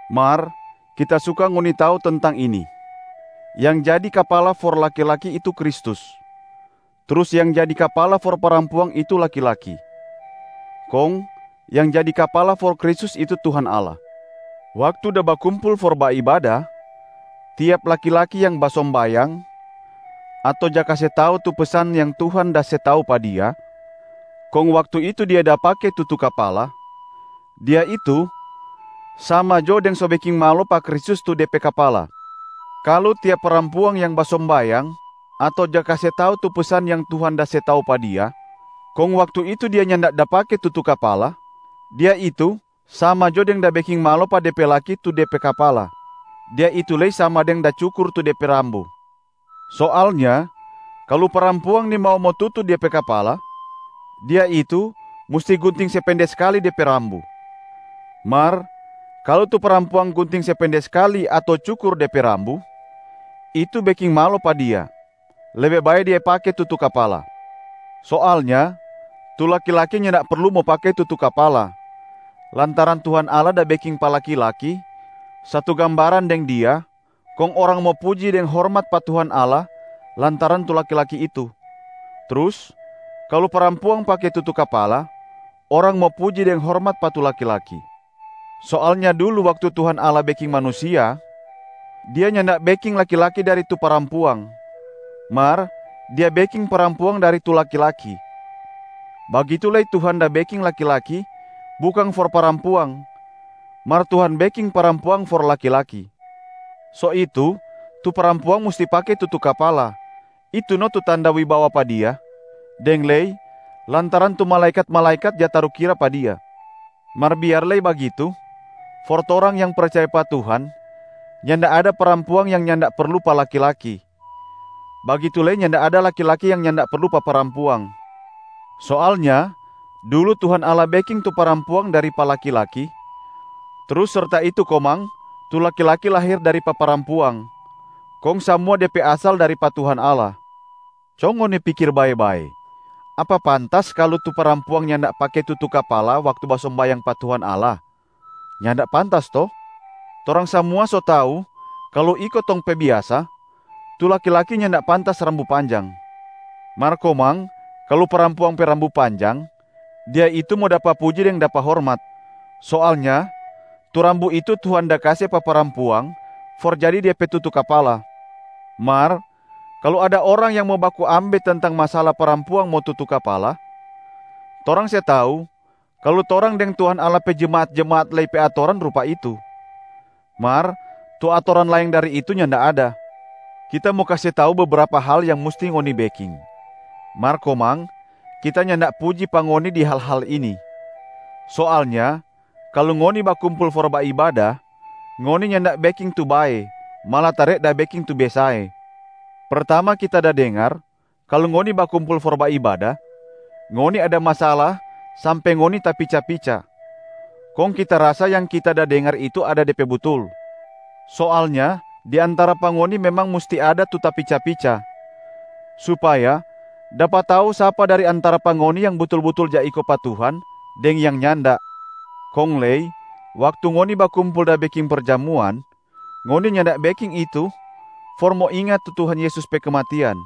Mar kita suka ngoni tau tentang ini: yang jadi Kapala for laki-laki itu Kristus, trus yang jadi kapala for parampuang itu laki-laki, kong yang jadi Kapala for Kristus itu Tuhan Allah. Waktu da bakumpul for baibada, tiap laki-laki yang basombayang ato ja kase tau tu pesan yang Tuhan da se tau pa dia, kong waktu itu dia da pake tutu kapala, dia itu sama jo deng so beking malo pa Kristus tu de pe Kapala. Kalu tiap parampuang yang basombayang ato ja kase tau tu pesan yang Tuhan da se tau pa dia, kong waktu itu dia nyanda da pake tutu kapala, dia itu sama jo deng da beking malo pa de pe laki tu de pe kapala, dia itu lei sama deng da cukur tu de pe rambu. Soalnya kalu parampuang nimau mo tutu dia pe kapala, dia itu musti gunting se pende skali de pe rambu. Mar kalu tu parampuang gunting se pende skali ato cukur de pe rambu, itu beking malo pa dia, lebe bae dia pake tutu kapala. Soalnya tu laki-laki nyanda perlu mo pake tutu kapala, lantaran Tuhan Allah da beking pa laki-laki satu gambaran deng Dia kong orang mo puji deng hormat pa Tuhan Allah lantaran tu laki-laki itu. Trus kalu parampuang pake tutu kapala, orang mo puji deng hormat pa tu laki-laki. Soalnya dulu waktu Tuhan Allah beking manusia, Dia nyanda beking laki-laki dari tu parampuang, mar Dia beking parampuang dari tu laki-laki. Bagitu lei Tuhan da beking laki-laki bukang for parampuang, mar Tuhan beking parampuang for laki-laki. So itu, tu parampuang musti pake tutu kapala, itu no tu tanda wibawa pa dia, deng lei lantaran tu malaekat-malaekat ja tarukira pa dia. Mar biar lei bagitu, for torang yang percaya pa Tuhan, nyanda ada parampuang yang nyanda perlu pa laki-laki, bagitu lei nyanda ada laki-laki yang nyanda perlu pa parampuang. Soalnya dulu Tuhan Allah beking tu parampuang dari pa laki-laki, trus serta itu komang tu laki-laki lahir dari pa parampuang, kong samua de pe asal dari pa Tuhan Allah. Co ngoni pikir bae-bae, apa pantas kalu tu parampuang nyanda pake tutu kapala waktu basombayang pa Tuhan Allah? Nyanda pantas to? Torang samua so tau kalu iko tong pe biasa, tu laki-laki nyanda pantas rambu panjang. Mar komang kalu parampuang pe rambu panjang, dia itu mo dapa puji deng dapa hormat. Soalnya tu rambu itu Tuhan da kase pa parampuang for jadi de pe tutu kapala. Mar kalu ada orang yang mo baku ambe tentang masala parampuang mo tutu kapala, torang se tau kalu torang deng Tuhan Allah pe jemaat-jemaat lei pe atoran rupa itu, mar tu atoran laeng dari itu nyanda ada. Kita mo kase tau bebrapa hal yang musti ngoni beking, mar komang kita nyanda puji pa ngoni di hal-hal ini. Soalnya kalu ngoni bakumpul for baibada, ngoni nyanda beking tu bae, malatare da beking tu besae. Pertama kita da dengar, kalu ngoni bakumpul for baibada, ngoni ada masala sampe ngoni tapica-pica, kong kita rasa yang kita da dengar itu ada de pe butul. Soalnya di antara pa ngoni memang musti ada tu tapica-pica, supaya dapa tau sapa dari antara pa ngoni yang butul-butul ja iko pa Tuhan deng yang nyanda. Kong lei waktu ngoni bakumpul da beking perjamuan, ngoni nyanda beking itu for mo inga tu Tuhan Yesus pe kematian.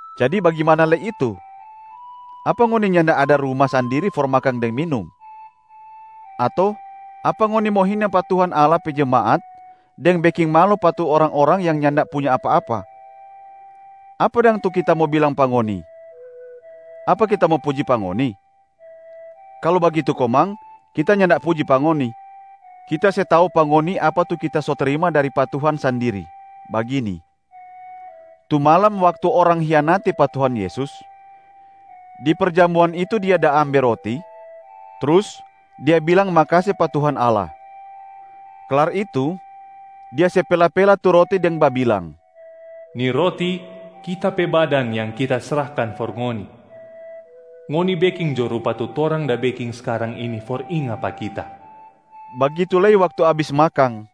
Jadi bagimana lei itu? Apa ngoni nyanda ada ruma sandiri for makang deng minum? Ato apa ngoni mo hina pa Tuhan Allah pe jemaat deng beking malo pa tu orang-orang yang nyanda punya apa-apa? Apa dang tu kita mo bilang pa ngoni? Apa kita mo puji pa ngoni? Kalu bagitu komang, kita nyanda puji pa ngoni. Kita se tau pa ngoni apa tu kita so trima dari pa Tuhan sandiri, bagini: tu malam waktu orang hianati pa Tuhan Yesus, di perjamuan itu Dia da ambe roti, trus Dia bilang makase pa Tuhan Allah. Klar itu Dia se pela-pela tu roti deng babilang, “Ni roti Kita pe badan yang Kita srahkan for ngoni. Ngoni beking jo rupa tu torang da beking skarang ini for inga pa Kita.” Bagitu lei waktu abis makang,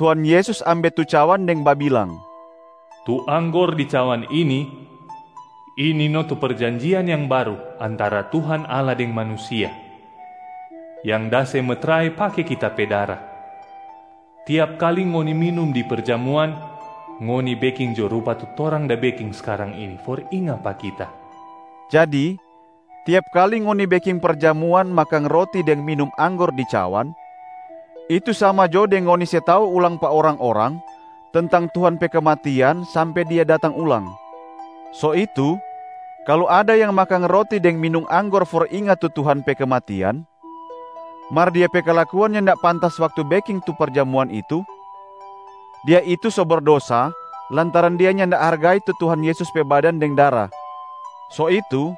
Tuhan Yesus ambe tu cawan deng babilang, “Tu anggor di cawan ini, ini no tu perjanjian yang baru antara Tuhan Allah deng manusia, yang da se metrai pake Kita pe dara. Tiap kali ngoni minum di perjamuan, ngoni beking jo rupa tu torang da beking skarang ini for inga pa Kita.” Jadi tiap kali ngoni beking perjamuan makang roti deng minum anggor di cawan, itu sama jo deng ngoni se tau ulang pa orang-orang tentang Tuhan pe kematian sampe Dia datang ulang. So itu, kalu ada yang makang roti deng minum anggor for inga tu Tuhan pe kematian, mar dia pe kalakuan nyanda pantas waktu beking tu perjamuan itu, dia itu so berdosa lantaran dia nyanda hargai tu Tuhan Yesus pe badan deng dara. So itu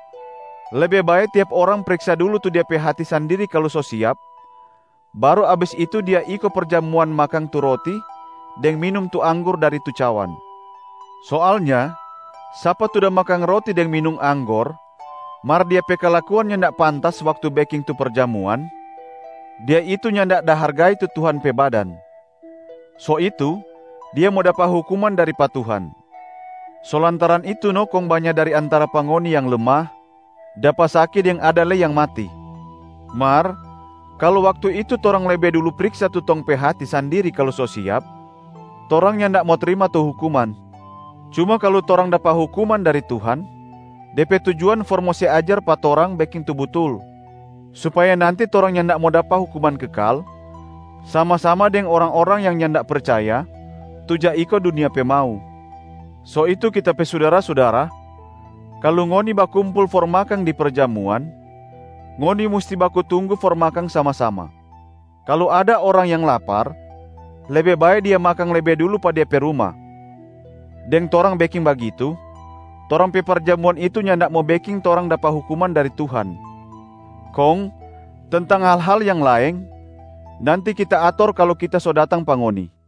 lebe bae tiap orang priksa dulu tu de pe hati sandiri kalu so siap, baru abis itu dia iko perjamuan makang tu roti deng minum tu anggor dari tu cawan. Soalnya sapa tu da makang roti deng minum anggor, mar dia pe kalakuan nyanda pantas waktu beking tu perjamuan, dia itu nyanda da hargai tu Tuhan pe badan. So itu dia mo dapa hukuman dari pa Tuhan. So lantaran itu no kong banya dari antara pa ngoni yang lemah, dapa saki deng ada lei yang mati. Mar kalu waktu itu torang lebe dulu priksa tu tong pe hati sandiri kalu so siap, torang nyanda mo trima tu hukuman. Cuma kalu torang dapa hukuman dari Tuhan, de pe tujuan for mo se ajar pa torang beking tu butul, supaya nanti torang nyanda mo dapa hukuman kekal sama-sama deng orang-orang yang nyanda percaya tu ja iko dunia pe mau. So itu kita pe sudara-sudara, kalu ngoni bakumpul for makang di perjamuan, ngoni musti baku tunggu for makang sama-sama. Kalu ada orang yang lapar, lebe bae dia makang lebe dulu pa de pe ruma. Deng torang beking bagitu, torang pe perjamuan itu nyanda mo beking torang dapa hukum dari Tuhan. Kong tentang hal-hal yang laeng, nanti kita ator kalu kita so datang pa ngoni.